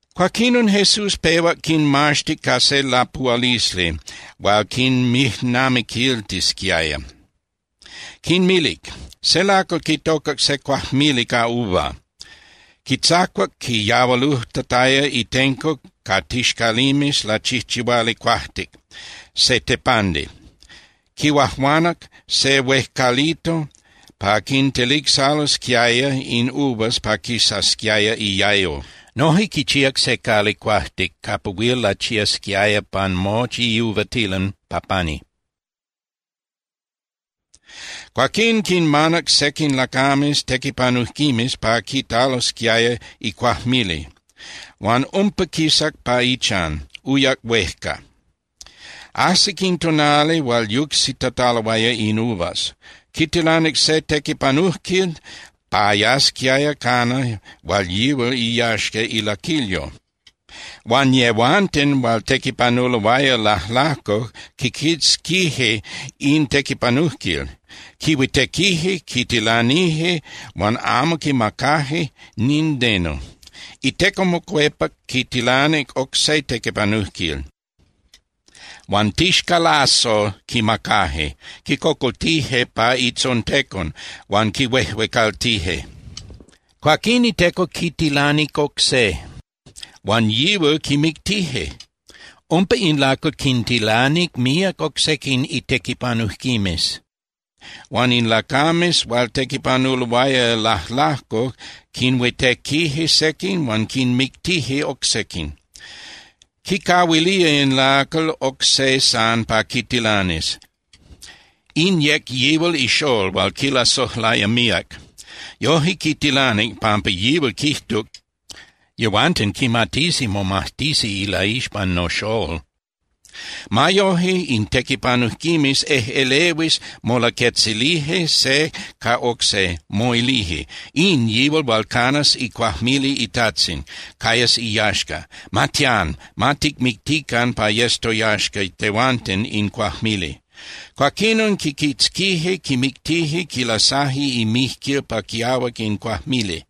Cuaquinon Jesús pehuac quinmaxtic ca se lapuhualisli hual quinmijnamiquiltisquiaya. Quinmilic: —Se lacal quitocac se cuajmili ca uva. Quitzacuac quiyahualujtataya itenco ca tixcalimes lachijchihuali cuajtic (se tepandi), quihuajuanac se huejcalito pa quintelicsalosquiaya in uvas pa quisasquiaya iayo. Noje quichíac se cali cuajtic capa huil lachiasquiaya pan mochi iuvatilan pa pani. Cuaquín quinmanac sequin lacames tequipanujquimes pa quitalosquiaya icuajmili, huan umpa quisac pa ichan, uyac huejca. Ajsic in tonali hual yucsitataloaya in uvas. Quitilanic se tequipanujquil pa yasquiaya cana hual yihual iyaxca ilaquilyo. Huan yehuanten hual tequipanuloaya lajlajco quiquitzquije in tequipanujquil. Quihuitequije, quitilanije huan amo quimacaje nindeno. Iteco mocuepac quitilanic oc se tequipanujquil, huan tixcalazos quimacaje, quicocoltije pa itzontecon huan quihuejuecaltije. Cuaquín iteco quitilanic oc se, huan yihual quimictije. Umpa in lacal quintilanic míac oc sequin itequipanujquimes huan in lacames hual tequipanuloaya lajlajco quinhuitequije sequin huan quinmictije oc sequin. ’Quicahuilía in lacal oc se san pa quitilanis, in yec yihual ixól hual quilasojlaya míac. Yoje quitilanic, pampa yihual quijtuc: “Yehuanten quimatisi momajtisi ilaixpan noxól.” Ma yoje, in tequipanujquimes ejꞌelehuis molaquetzilije se ca oc se, moilije: “In yihual hual canas icuajmili itajtzin, cayas iyaxca. Ma tián, ma ticmictican pa yes toyaxca tehuanten in cuajmili.” Cuaquinon quiquitzquije, quimictije, quilasaje imijquil pa quiahuac in cuajmili.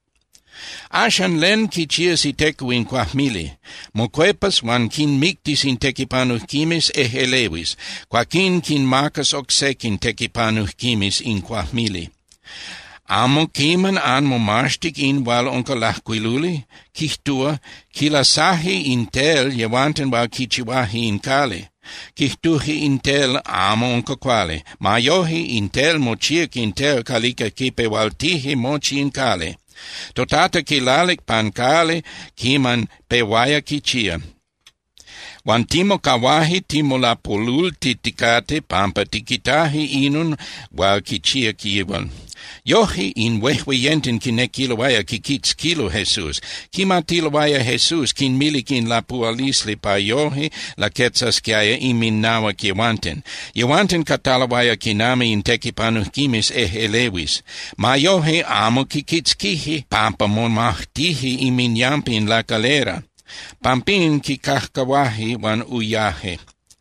’Axan, ¿len quichías iteco in cuajmili? Mocuepas huan quinmictis in tequipanujquimes ejꞌelehuis. Cuaquín quinmacas oc sequin tequipanujquimes in cuajmili. ’¿Amo quiman anmomaxtic in hual unca lajcuiluli? Quijtúa: Quilasaje in tel yehuanten hual quichihuaje in cali, quijtuje in tel amo unca cuali. Ma yoje, in tel mochíac in tel calica quipehualtije mochi in cali. ToTata quilalic pan cali quiman pehuaya quichía, huan timocahuaje timolapolultiticate pampa tiquitaje inon hual quichíac yihual. Yoje, in huejueyenten quinequiloaya quiquitzquilo Jesús. Quimatiloaya Jesús quinmilic in lapuhualisli pa yoje laquetzasquiaya inminahuac yehuanten. Yehuanten cataloaya quinami in tequipanujquimes ejꞌelehuis. Ma yoje, amo quiquitzquije pampa momajtije inminyampa in lacalera. Pampín quicajcahuaje huan uyaje.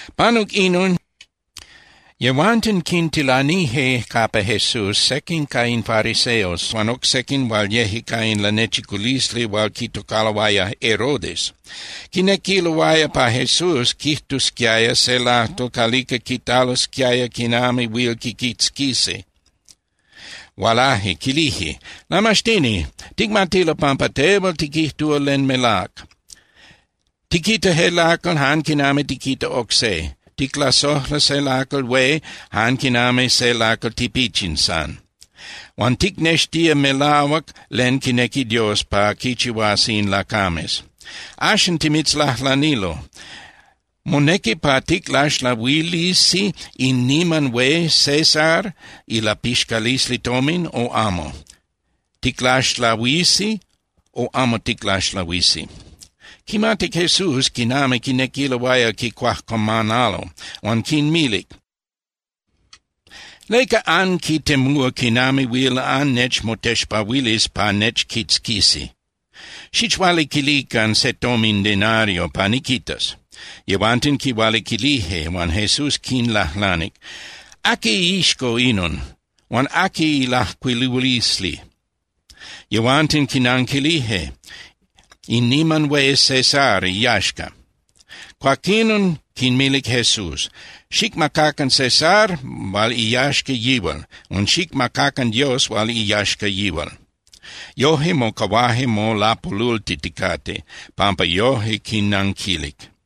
Panuc inon, yehuanten quintilanije capa Jesús sequin ca in fariseos huan oc sequin hual yeje ca in lanechiculisli hual quitocaloaya Herodes. Quinequiloaya pa Jesús quijtusquiaya se lajtol calica quitalosquiaya quinami huil quiquitzquisi. Hualaje quilije: —Lamaxtini, ticmatilo pampa tehual tiquijtúa len melác. Tiquita je lacal jan quinami tiquita oc se, ticlasojla se lacal hué jan quinami se lacal tipichin san. Huan ticnextía melahuac len quinequi Dios pa quichihuasi in lacames. Axan timitzlajlanilo, ¿monequi pa ticlaxlahuilisi in niman hué César ilapixcalisli tomin, o amo? ¿Ticlaxlahuisi, o amo ticlaxlahuisi? Quimatic Jesús quinami quinequiloaya quicuajcuamanalo, huan quinmilic: —¿Leca anquitemúa quinami huil annechmotexpahuilis pa nechquitzquisi? Xichualiquilican se tomin denario pa niquitas. Yehuanten quihualiquilije huan Jesús quinlajlanic: —¿Aqui iixco inon? Huan ¿aqui ilajcuilulisli? Yehuanten quinanquilije: —In niman hué César iyaxca. Cuaquinon quinmilic Jesús: —Xicmacacan César hual iyaxca yihual, huan xicmacacan Dios hual iyaxca yihual. Yoje, mocahuaje molapolultiticate pampa yojque quinnanquilic.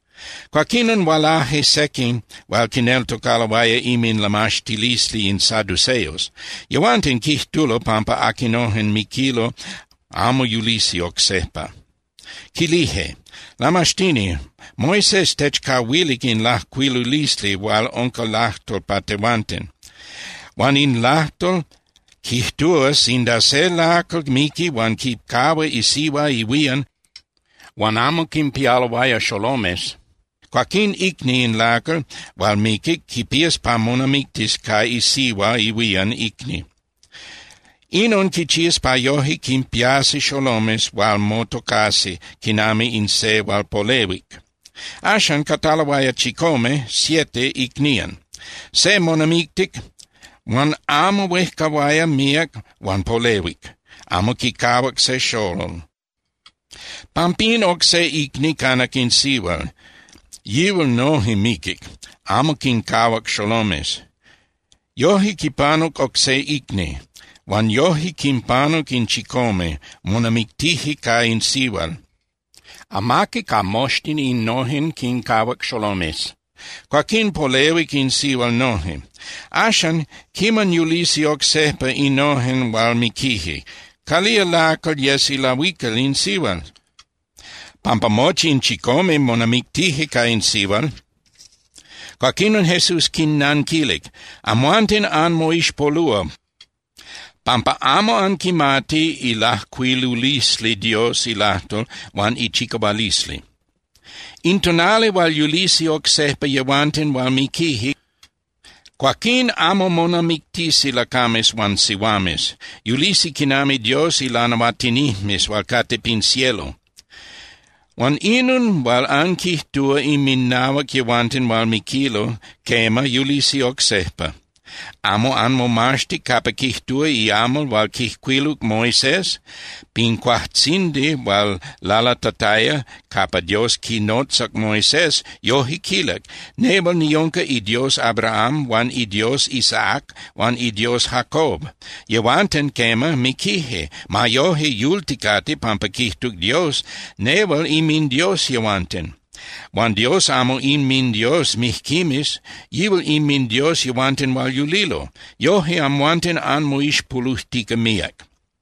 Cuaquinon hualaje sequin hual quineltocaloaya inminlamaxtilisli in saduceos. Yehuanten quijtulo pampa aquinojen miquilo amo yulisi oc sejpa. Quilije: —Lamaxtini, Moisés techcahuilic in lajcuilulisli hual unca lajtol pa tehuanten. Huan in lajtol quijtúa sinda se lacal miqui huan quicahua isihua ihuían huan amo quinpialoaya xolomes, cuaquín icni in lacal hual miquic quipías pa monamictis ca isihua ihuían icni. Inon quichías pa yoje quinpiasi xolomes hual motocasi quinami in se hual polehuic. Axan, cataloaya chicome (siete) icnían. Se monamictic, huan amo huejcahuaya míac huan polehuic, amo quicahuac se xolol. Pampín, oc se icni canac in sihual, yihual noje miquic, amo quincahuac xolomes. Yoje quipanuc oc se icni. Huan yoje quinpanuc in chicome, monamictije ca in sihual. Amaqui ca moxtin innojen quincahuac xolomes. Cuaquín, polehuic in sihual noje. Axan, quiman yulisi oc sejpa innojen hual miquije, ¿calía lacal yes ilahuical in sihual? Pampa mochi in chicome monamictije ca in sihual. Cuaquinon Jesús quinnanquilic: —Amhuanten anmoixpolúa, pampa amo anquimati ilajcuilulisli Dios ilajtol huan ichicahualisli. In tonali hual yulisi oc sejpa yehuanten hual miquije, cuaquín amo monamictisi lacames huan sihuames. Yulisi quinami Dios ilanahuatinijmes hual cate pin cielo. Huan inon hual anquijtúa inminahuac yehuanten hual miquilo, quema, yulisi oc sejpa. ¿Amo anmomaxtic capa quijtúa iamal hual quijcuiluc Moisés? Pin cuajtzindi hual lalatataya capa Dios quinotzac Moisés, yoje quilic: “Nehual niunca iDios Abraham huan iDios Isaac huan iDios Jacob.” Yehuanten, quema, miquije. Ma yoje, yulticate, pampa quijtuc Dios: “Nehual inminDios yehuanten.” Huan Dios amo inminDios mijquimes. Yihual inminDios yehuanten hual yulilo. Yoje amhuanten anmoixpolujtica míac.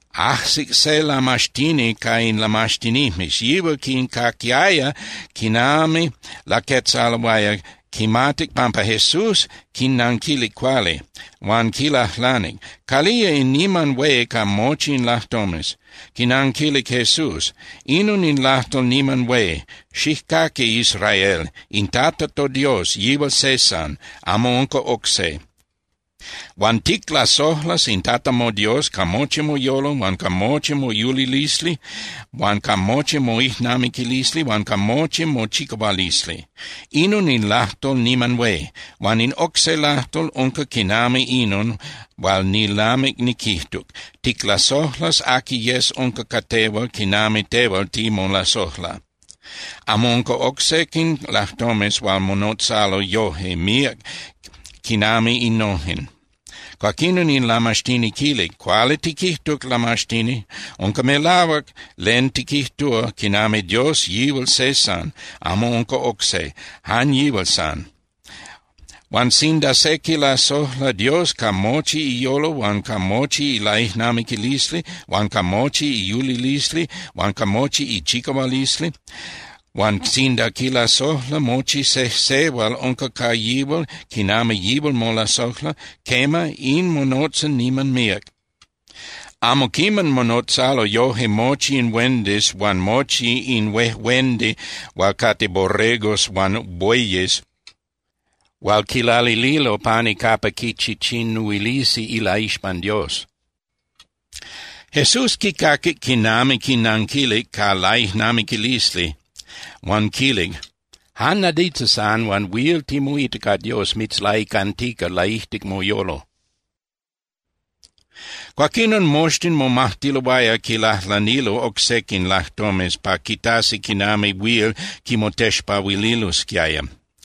Ajsic se lamaxtini ca in lamaxtinijmes. Yihual quincaquiaya quiman laquetzaloaya, quimatic pampa Jesús quinnanquilic cuali. Huan quilajlanic: —¿Calía in niman hué ca mochi in lajtomes? Quinanquilic Jesús: —Inon in lajtol niman hué: “Xijcaqui, Israel. In Tata toDios, yihual se san, amo unca oc se. Huan ticlasojlas in Tata moDios ca mochi moyolo huan ca mochi moyulilisli huan ca mochi moijnamiquilisli huan ca mochi mochicahualisli.” Inon in lajtol niman hué. Huan in oc se lajtol unca quinami inon hual nilamic niquijtuc: “Ticlasojlas aqui yes unca ca tehual quinami tehual timolasojla.” Amo unca oc sequin lajtomes hual monotzalo yoje míac quinami innojen. Cuaquinon in lamaxtini quilic: —Cuali tiquijtuc, Lamaxtini. Unca melahuac len tiquijtúa quinami Dios yihual se san. Amo unca oc se, jan yihual san. Huan sinda se quilasojla Dios ca mochi iyolo huan ca mochi ilaijnamiquilisli huan ca mochi iyulilisli huan ca mochi ichicahualisli, huan sinda quilasojla mochi sejse hual unca ca yihual quinami yihual molasojla, quema, in monotza niman míac. Amo quiman monotzalo yoje mochi in huendis huan mochi in huejuendi hual cate borregos huan bueyes hual quilalililo pani capa quichichinuilisi ilaixpan Dios. Jesús quicaquic quinami quinanquilic ca laijnamiquilisli huan quilic: —Jan nadita san huan huil timoita ca Dios mitzlaicantica laijtic moyolo. Cuaquinon moxtin momajtiloaya quilajlanilo oc sequin lajtomes pa quitasi quinami huil quimotexpahuililosquiaya.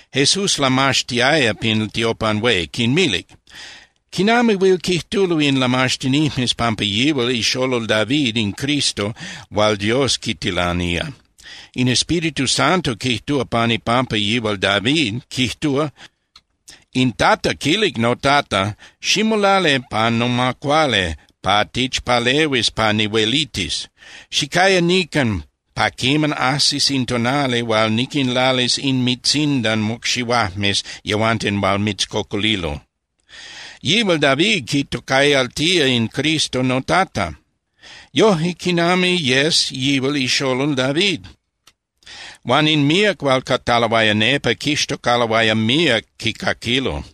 Jesús lamaxtiaya pin tiopan hué, quinmilic: —¿Quinami huil quijtulo in lamaxtinijmes pampa yihual ixolol David in Cristo hual Dios quitilanía? In Espíritu Santo quijtúa pan ipampa yihual David, quijtúa: In Tata quilic noTata: “Ximolali pa noma cuali pa tichpalehuis pa nihuelitis. Xicaya nican pa quiman ajsis in tonali hual niquinlalis inmintzindan mocxihuajmes yehuanten hual mitzcocolilo.” Yihual David quitocayaltía in Cristo noTata. Yoje, ¿quinami yes yihual ixolol David? Huan in míac hual cataloaya nepa quixtocaloaya míac quicaquilo.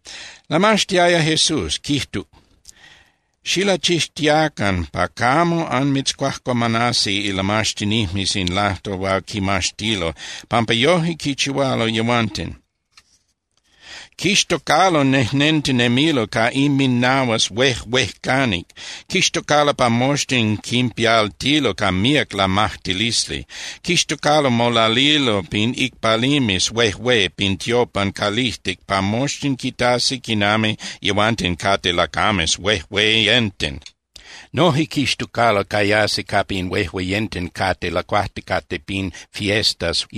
Lamaxtiaya Jesús, quijtuc: —Xilachixtiacan pa camo anmitzcuajcuamanasi ilamaxtinijmes in lajtol hual quimaxtilo, pampa yoje quichihualo yehuanten. Quixtocalo nejnentinemilo ca inminahuas huejuejcanic. Quixtocalo pa moxtin quinpialtilo ca míac lamajtilisli. Quixtocalo molalilo pin icpalimes huejué pin tiopan calijtic pa moxtin quitasi quinami yehuanten cate lacames huejueyenten. Noje quixtocalo cayasi capa in huejueyenten cate lacuajticate pin fiestas.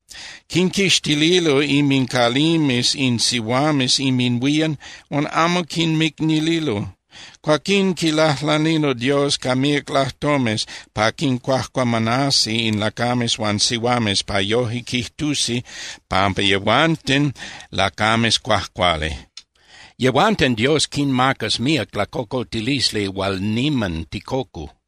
Quinquixtililo inmincalimes in sihuames inminhuían huan amo quinmicnililo. Cuaquín quilajlanilo Dios ca míac lajtomes pa quincuajcuamanasi in lacames huan sihuames pa yoje quijtusi pampa yehuanten lacames cuajcuali. Yehuanten Dios quinmacas míac lacocoltilisli hual niman ticocu.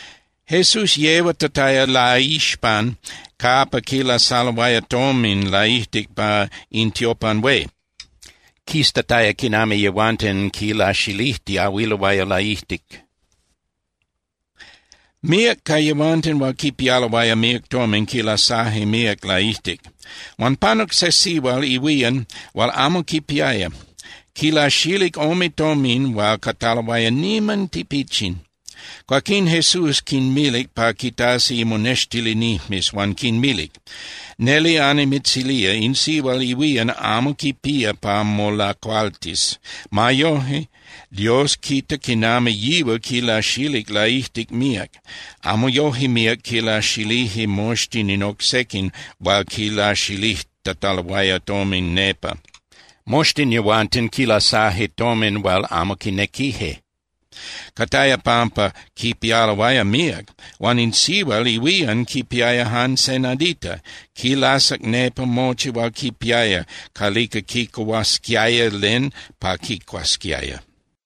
Jesús yehuatataya laixpan capa quilasaloaya tomin laijtic pa in tiopan hué, quiztataya quinami yehuanten quilaxilijtiahuiloaya laijtic. Míac ca yehuanten hual quipialoaya míac tomin quilasaje míac laijtic. Huan panuc se sihual ihuían hual amo quipiaya. Quilaxilic ome tomin hual cataloaya niman tipichin. Cuaquín Jesús quinmilic pa quitasi imonextilinijmes huan quinmilic: —Neli annimitzilía, in sihual ihuían amo quipía pa molacualtis. Ma yoje, Dios quita quinami yihual quilaxilic laijtic míac. Amo yoje míac quilaxilije moxtin in oc sequin hual quilaxilijtataloaya tomin nepa. Moxtin yehuanten quilasaje tomin hual amo quinequije, cataya pampa quipialoaya míac. Huan in sihual ihuían quipiaya jan se nadita. Quilasac nepa mochi hual quipiaya calica quicuhuasquiaya len pa quicuasquiaya.